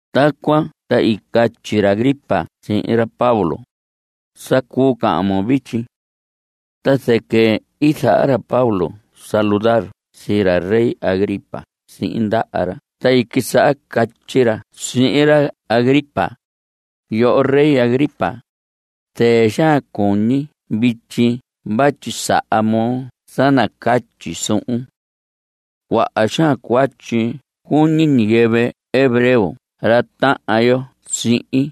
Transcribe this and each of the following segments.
Tacuan ta i catyi ra Agripa sihin ra Pablo: Sa cuu cahan moo vityi. Ta zɨquɨ i zaha ra Pablo saludar sii ra rey Agripa sihin ndaha ra ta i quisaha catyi ra sihin ra Agripa: Yoho rey Agripa, zɨɨ xaan cuñi vityi vatyi saha moo sa nacatyi suhun. Cuaha xaan cuatyi cuñi ñiyɨvɨ hebreo ra tahan yo sihin.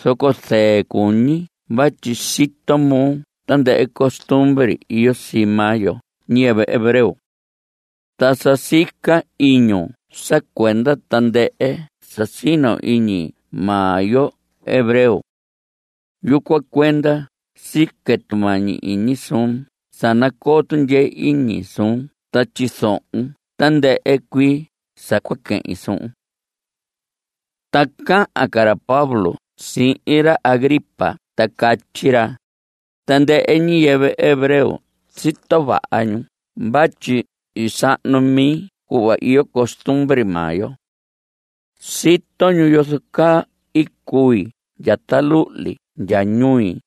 Zoco zɨɨ cuñi vatyi sito moo tandɨhɨ costumbre iyo sii maa yo ñiyɨvɨ hebreo. Ta sa sica iñun sa cuenda tandɨhɨ sa sino iñi maa yo hebreo. Yucuan cuenda sique tumañi iñi suun sa nacoo tundyee iñi suun ta tyizohon tandɨhɨ cuii sa cua quehin suhun. Ta cahan ca ra Pablo sihin ra Agripa ta catyi ra: Tandɨhɨ ñiyɨvɨ hebreo sito vaha ñu vatyi i sahnu mi cuhva iyo costumbre maa yo. Sito ñu yozo caa i cui ndya ta luhli ndya ñui.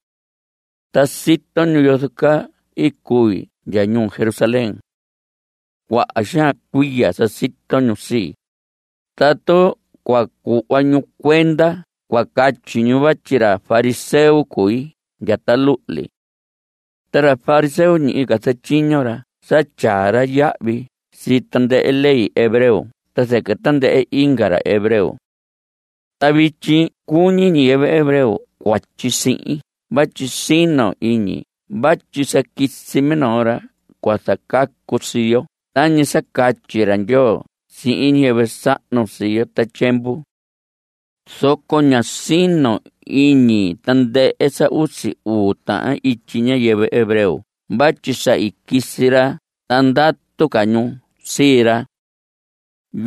Ta sito ñu yozo caa i cui ndya ñuu Jerusalén. Cuaha xaan cuiya sa sito ñu sii. Tatu cua cuhva ñu cuenda cua catyi ñu vatyi ra fariseo cui ndya ta luhli. Ta ra fariseo, ñihi ca zatyiño ra sa tyaa ra yahvi sii tandɨhɨ ley hebreo ta zɨquɨ tandɨhɨ inga ra hebreo. Ta vityi cuñi ñiyɨvɨ hebreo cuatyi sihin vatyi sino iñi vatyi sa quisi minoo ra cua zacacu sii yo tañi sa catyi ra Ndyoo sihin ñiyɨvɨ sahnu sii yo ta tyiemvu. Zoco ña sino iñi tandɨhɨ sa usi uu tahan ityi ñiyɨvɨ hebreo vatyi sa i quisi ra ta ndatu ca ñu sii ra.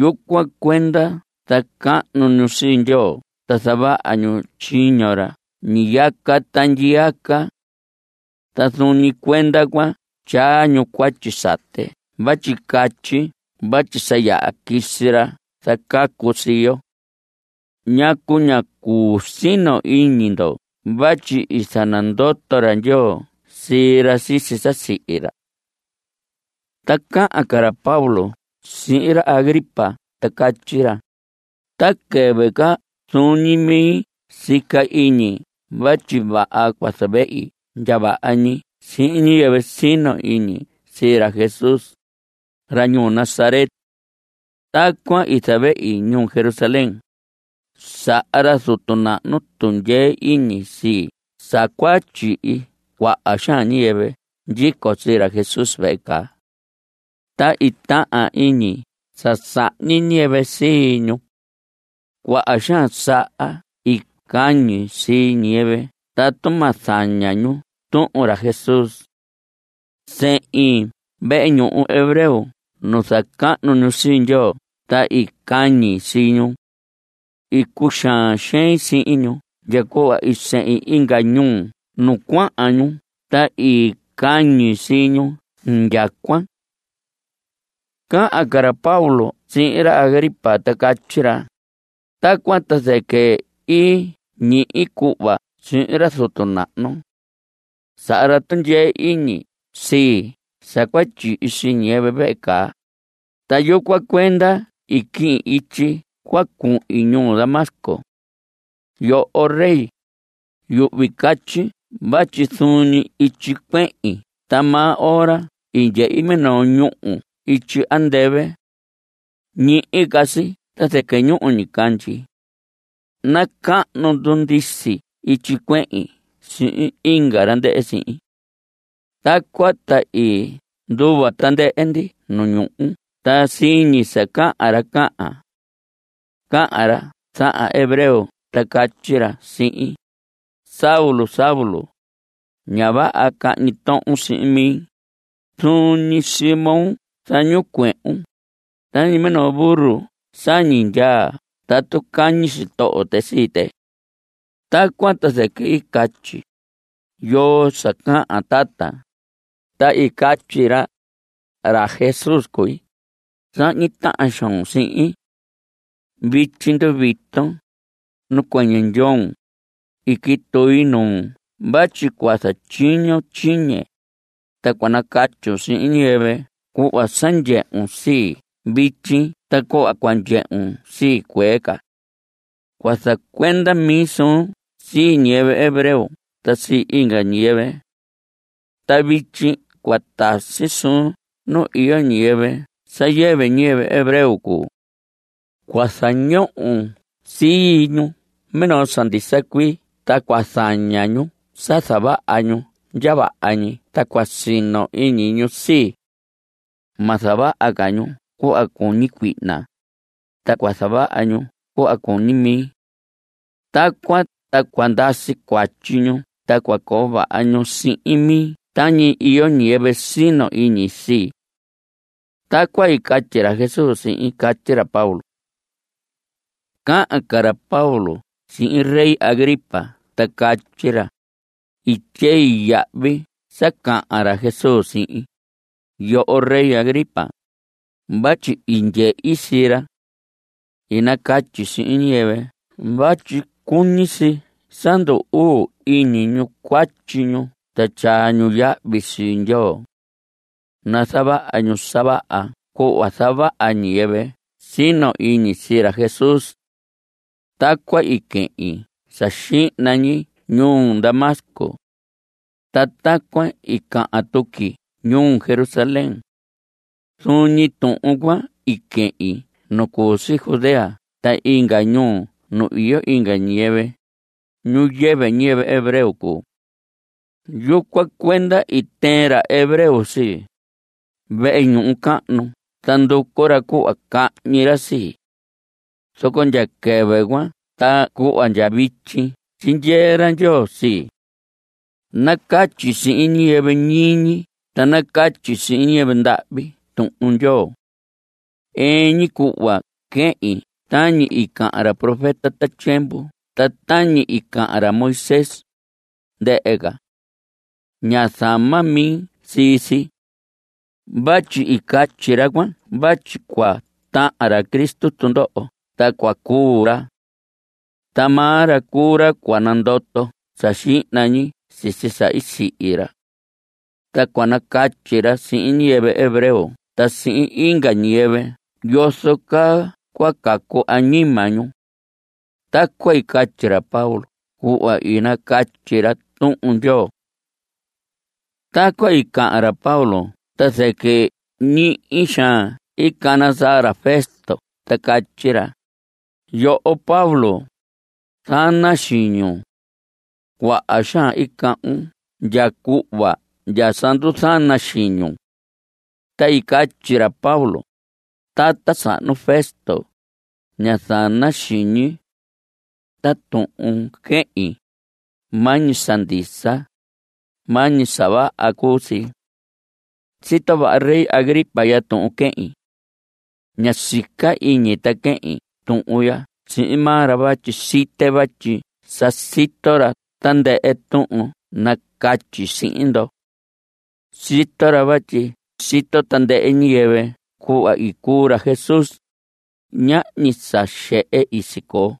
Yucuan cuenda zacahnu ñu sii Ndyoo ta zavaha ñu tyiño ra ñiyaca ta ndyiyaca. Ta zuun ñi cuenda cuan tyaa ñu cuatyi sate vatyi catyi vatyi sa yaha quisi ra zacacu sii yo. ¿Ñacu ña cuu sino iñi ndo vatyi i zanandoto ra Ndyoo sii ra sisi sa i sihi ra? Ta cahan ca ra Pablo sihin ra Agripa ta catyi ra: Ta quɨvɨ ca zuun ñi mi sica iñi vatyi vaha cua zavehi ndya vaha ñi sihin ñiyɨvɨ sino iñi sii ra Jesús, ra ñuu Nazaret. Tacuan i zavehi ñuu Jerusalén. Saha ra zutu nahnu tundyee iñi sii sa cua tyihi cuaha xaan ñiyɨvɨ ndyico sii ra Jesús vehe caa. Ta i tahan iñi sa sahñi ñiyɨvɨ sii ñu. Cuaha xaan saha i cañi sii ñiyɨvɨ tatu ma zaña ñu tuhun ra Jesús. Sehin vehe ñuhu hebreo nu zacahnu ñu sii Ndyoo ta i cañi sii ñu. I cuxaan xein sihin ñu ndya cuhva i sehin inga ñuu nu cuahan ñu ta i cañi sii ñu indyacuan. Cahan ca ra Pablo sihin ra Agripa ta catyi ra: Tacuan ta zɨquɨ i ñihi cuhva sihin ra zutu nahnu. Saha ra tundyee iñi sii sa cua tyihi sii ñiyɨvɨ vehe caa, ta yucuan cuenda i quihin ityi cua cuhin ñuu Damasco. Yoho rey, yuhvi catyi vatyi zuun ñi ityi cuehin ta maa ora i ndyehi minoo ñúhu ityi andɨvɨ. Ñihi ca si ta zɨquɨ ñuhu ñicandyi. Nacahnu ndundisi ityi cuehin sihin inga ra ndɨhɨ sihin. Tacuan ta i nduva tandɨhɨ ndi nu ñuhu ta siñi sa cahan ra cahan. Cahan ra zahan hebreo ta catyi ra sihin: “Saulo, Saulo. Ña vaha cahñi tohon sihin mi. Zuun ñi sii moo zañicuehun. Tañi minoo burro sañi ndyaa tatu cañi sitoho tɨ sii tɨ.” Tacuan ta zɨquɨ i catyi: “¿Yoo sa cahan, tata?” Ta i catyi ra: “Ra Jesús cui. Sahñi tahan xoon sihin. Vityi nduviton. Nacuɨñɨ ndyoon. I quitui nuun vatyi cua zatyiñon tyiñe, ta cua nacatyun sihin ñiyɨvɨ cuhva sa ndyehun sii vityi ta cuhva cua ndyehun sii cuee ca. Cua zacuenda mi suun sii ñiyɨvɨ hebreo ta sii inga ñiyɨvɨ. Ta vityi cua tasi suun nu iyo ñiyɨvɨ sa yɨvɨ ñiyɨvɨ hebreo cuu. Cua zañohon sii ñu minoo sa ndisa cuii ta cua zaña ñu sa zavaha ñu ndya vaha ñi ta cua sino iñi ñu sii. Ma zavaha ca ñu cuhva cuñi cuihna, ta cua zavaha ñu cuhva cuñi mi. Tacuan ta cua ndasi cuatyi ñu ta cua coo vaha ñu sihin mi tañi iyo ñiyɨvɨ sino iñi sii.” Tacuan i catyi ra Jesús sihin. Catyi ra Pablo. Cahan ca ra Pablo sihin rey Agripa ta catyi ra: I tyei yahvi sa cahan ra Jesús sihin, yoho rey Agripa, vatyi i ndyehi sii ra. I nacatyi sihin ñiyɨvɨ vatyi cuñi si sa ndu‑uu iñi ñu cuatyi ñu ta tyaa ñu yahvi sii Ndyoo. Nazavaha ñu sa vaha cuhva zavaha ñiyɨvɨ sino iñi sii ra Jesús. Tacuan i quehin sa xihna ñi ñuu Damasco. Ta tacuan i cahan tuqui ñuu Jerusalén. Zuun ñi tuhun cuan i quehin nu cu si Judea ta inga ñuu nu iyo inga ñiyɨvɨ, ñu yɨvɨ ñiyɨvɨ hebreo cuu. Yucuan cuenda i tɨɨn ra hebreo sii, vehe ñuhu cahnu ta nducu ra cuhva cahñi ra sii. Zoco ndya quɨvɨ cuan ta cuhva ndya vityi tyindyee ra Ndyoo sii. Nacatyi sihin ñiyɨvɨ ñiñi ta nacatyi sihin ñiyɨvɨ ndahvi Tuhun Ndyoo. Ɨɨn ñi cuhva quehin tañi i cahan ra profeta ta tyiemvu ta tañi i cahan ra Moisés, ndɨhɨ ca. Ña zama mi sii si. Vatyi i catyi ra cuan vatyi cua tahan ra Cristo tundoho ta cua cuu ra. Ta maa ra cuu ra cua nandoto sa xihna ñi sisi sa i sihi ra. Ta cua nacatyi ra sihin ñiyɨvɨ hebreo ta sihin inga ñiyɨvɨ yozo caa cua cacu añima ñu. Tacuan i catyi ra Pablo cuhva i nacatyi ra Tuhun Ndyoo. Tacuan i cahan ra Pablo ta zɨquɨ ñihi xaan i cana saa ra Festo ta catyi ra: Yoho Pablo, zana xiñun. Cuaha xaan i cahvun ndya cuhva ndya sa nduzana xiñun. Ta i catyi ra Pablo: Tata sahnu Festo, ña zana xiñi. Ta tuhun quehin, maa ñi sa ndisa, maa ñi sa vaha cuu si. Sito vaha rey Agripa ya tuhun quehin. Ña sica iñi ta quehin tuhun ya sihin maa ra vatyi site vatyi sa sito ra tandɨhɨ tuhun nacatyi sihin ndo. Sito ra vatyi sito tandɨhɨ ñiyɨvɨ cuhva i cuu ra Jesús. Ñahñi sa xehe i sicoo.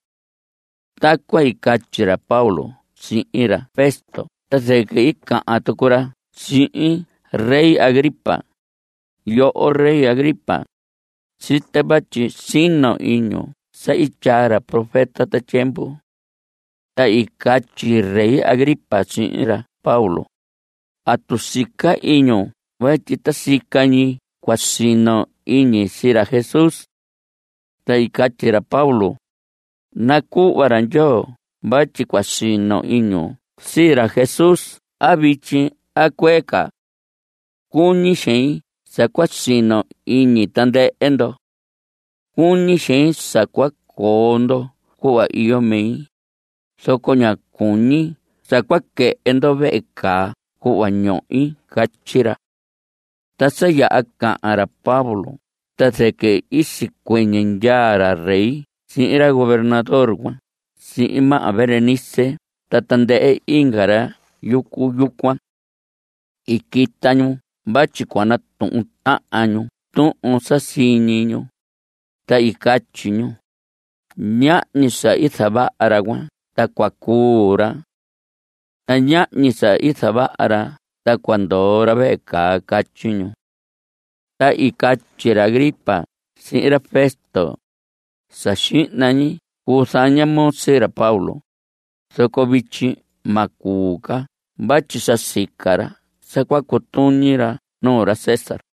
Tacuan i catyi ra Pablo sihin ra Festo ta zɨquɨ i cahan tucu ra sihin rey Agripa: Yoho rey Agripa, site vatyi sino iñun sa i tyaa ra profeta ta tyiemvu. Ta i catyi rey Agripa sihin ra Pablo: ¿Atu sica iñun vatyi ta sica ñi cua sino iñi sii ra Jesús? Ta i catyi ra Pablo: Nacuhva ra Ndyoo vatyi cua sino iñun sii ra Jesús a vityi a cuee ca. Cuñi xein sa cua sino iñi tandɨhɨ ndo. Cuñi xein sa cua coo ndo cuhva iyo mi, zoco ña cuñi sa cua quɨhɨ ndo vehe caa cuhva ñohi. Catyi ra. Ta sa yaha cahan ra Pablo ta zɨquɨ i sicuɨñɨ ndyaa ra rey sihin ra gobernador cuan sihin maha Berenice ta tandɨhɨ inga ra yucu yucuan. I quita ñu vatyi cua natuhun tahan ñu tuhun sa siñi ñu. Ta i catyi ñu: Ñahñi sa i zavaha ra cuan ta cua cuu ra. Ta ñahñi sa i zavaha ra ta cua ndoo ra vehe caa. Catyi ñu. Ta i catyi ra Agripa sihin ra Festo: Sa xihna ñi cuu zaña moo sii ra Pablo, zoco vityi ma cuu ca vatyi sa sica ra sa cua cutuñi ra nuu ra César.